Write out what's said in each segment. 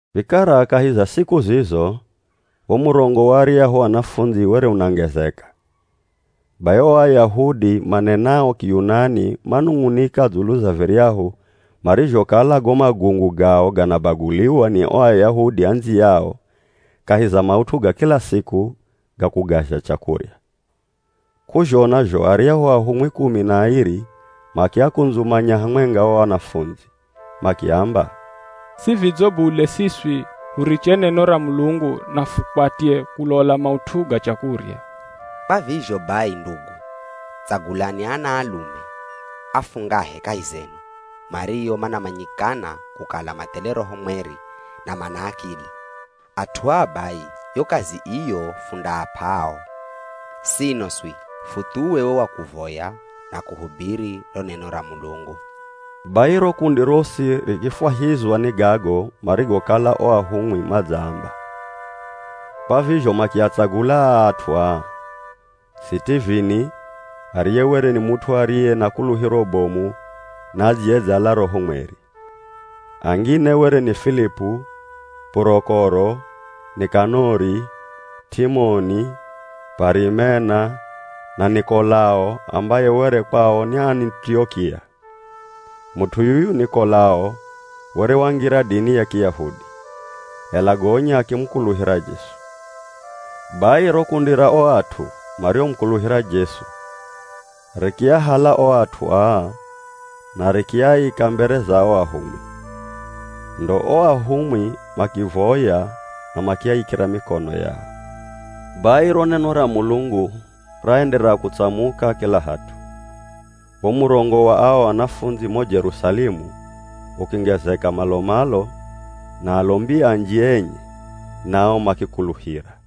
Vikara kahi za siku zizo, wo murongo wa aryahu anafundzi were unangezeka. Bai o Ayahudi manenao Kiyunani manung'unika dzulu za viryahu marizhokala go magungu gao ganabaguliwa ni o Ayahudi andziyao kahi za maut'u ga kila siku ga kugazha chakurya. K'uzhona zho aryahu ahumwi kumi na airi makiakundzumanya hamwenga o anafundzi, makiamba, “Si vidzo bule siswi huriche neno ra Mulungu na fukwatye kulola maut'u ga chakurya. Kwa vizho bai ndugu, tsagulani anaalume afungahe kahi zenu mario manamanyikana kukala mathele Roho Mweri na mana akili. At'u aa bai yo kazi iyo fundaap'a ao, sino swi, futhuwe wo wa kuvoya na kuhubiri ro neno ra Mulungu.” Bai ro kundi rosi rikifwahizwa ni gago marigokala o ahumwi madzaamba, kwa vizho makiatsagula aa at'u aa: Sitivini, ariye were ni mut'u ariye na kuluhiro bomu na adziyedzala Roho Mweri. Angine were ni Filipu, Purokoro, Nikanori, T'imoni, P'arimena, na Nikolao ambaye were kwao ni Anitiokia. Mut'u yuyu Nikolao were wangira dini ya Kiyahudi, ela gonya akimukuluhira Jesu. Bai ro kundi ra o at'u mariomukuluhira Jesu rikiahala o at'u aa na rikiaika mbere za o ahumwi. Ndo o ahumwi makivoya na makiaikira mikono yao. Bai ro neno ra Mulungu raenderera kutsamuka kila hat'u. Wo murongo wa ao anafundzi mo Jerusalemu ukingezeka malo-malo na alombi anji enye nao makikuluhira.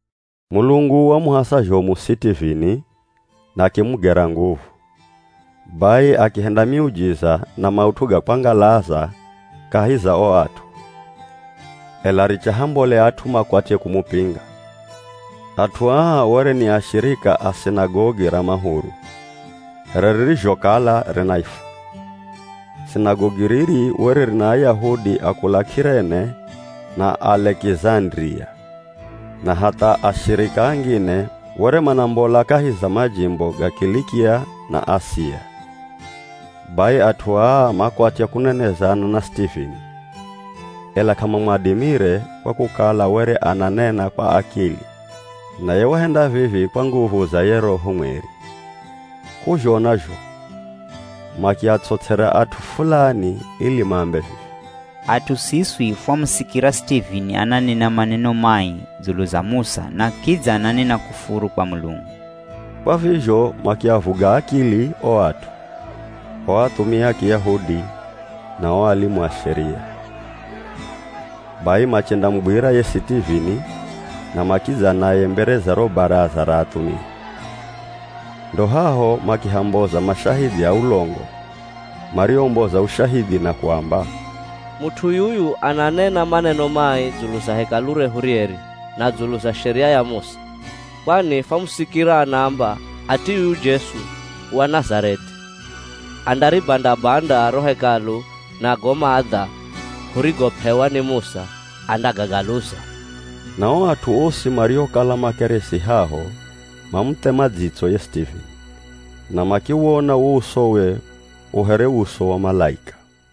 Mulungu wamuhasa zhomu Sitivini na akimugera nguvu, bai akihenda miujiza na maut'u ga kwangalaza kahi za o at'u. Ela richa hambole at'u makwatye kumupinga. At'u aa were ni ashirika a Sinagogi ra Mahuru (here ririzhokala rinaifwa). Sinagogi riri were rina Ayahudi a kula K'irene na Alekizandiria, na hatha ashirika angine were manambola kahi za majimbo ga Kilikia na Asia. Bai at'u aa makwatya kunenezana na Sitivini, ela k'amamwadimire kwa kukala were ananena kwa akili, naye wahenda vivi kwa nguvu za ye Roho Mweri. K'uzhona zho makiats'ots'era at'u fulani ili maambe vivi, “At'u siswi fwamusikira Sitivini ananena maneno mai dzulu za Musa na kidza ananena kufuru kwa Mulungu.” Kwa vizho makiavuga akili o at'u, o athumia a Kiyahudi na o alimu a Sheria. Bai machendamugwira ye Sitivini na makidza naye mbere za ro baraza ra athumia. Ndo haho makihamboza mashahidhi a ulongo mariomboza ushahidhi na kuamba, “Mut'u yuyu ananena maneno mai dzulu za Hekalu rehu rieri na dzulu za Sheria ya Musa. Kwani fwamusikira anaamba ati yuyu Jesu wa Nazareth'i andaribanda-banda ro Hekalu na go maadha hurigop'ewa ni Musa andagagaluza.” Na o at'u osi mariokala makeresi haho mamuthema dzitso ye Sitivini, na makiwona wo usowe u here uso wa malaika.